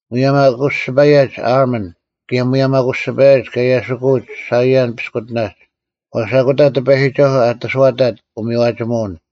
ᒧᔭᒻ ᐊᑯᔅᒋᐸᔭᒡ ᐦᐊᕐᒧᓐ, ᑭᔭ ᒧᔭᒻ ᐊᑯᔅᒋᐸᔭᒡ ᑲ ᐃᔭᓯᑯᐅᒡ ᓴᐃᔭᓐ ᐱᔅᑯᑎᓇᒡ; ᐛᔅ ᐊᑯᑕ ᑎᐸᔨᒋᒐᓱᐤ ᐊᑕᓱᐛᑕᑦ ᐅᒥᔽᒋᒧᐛᐅᓐ,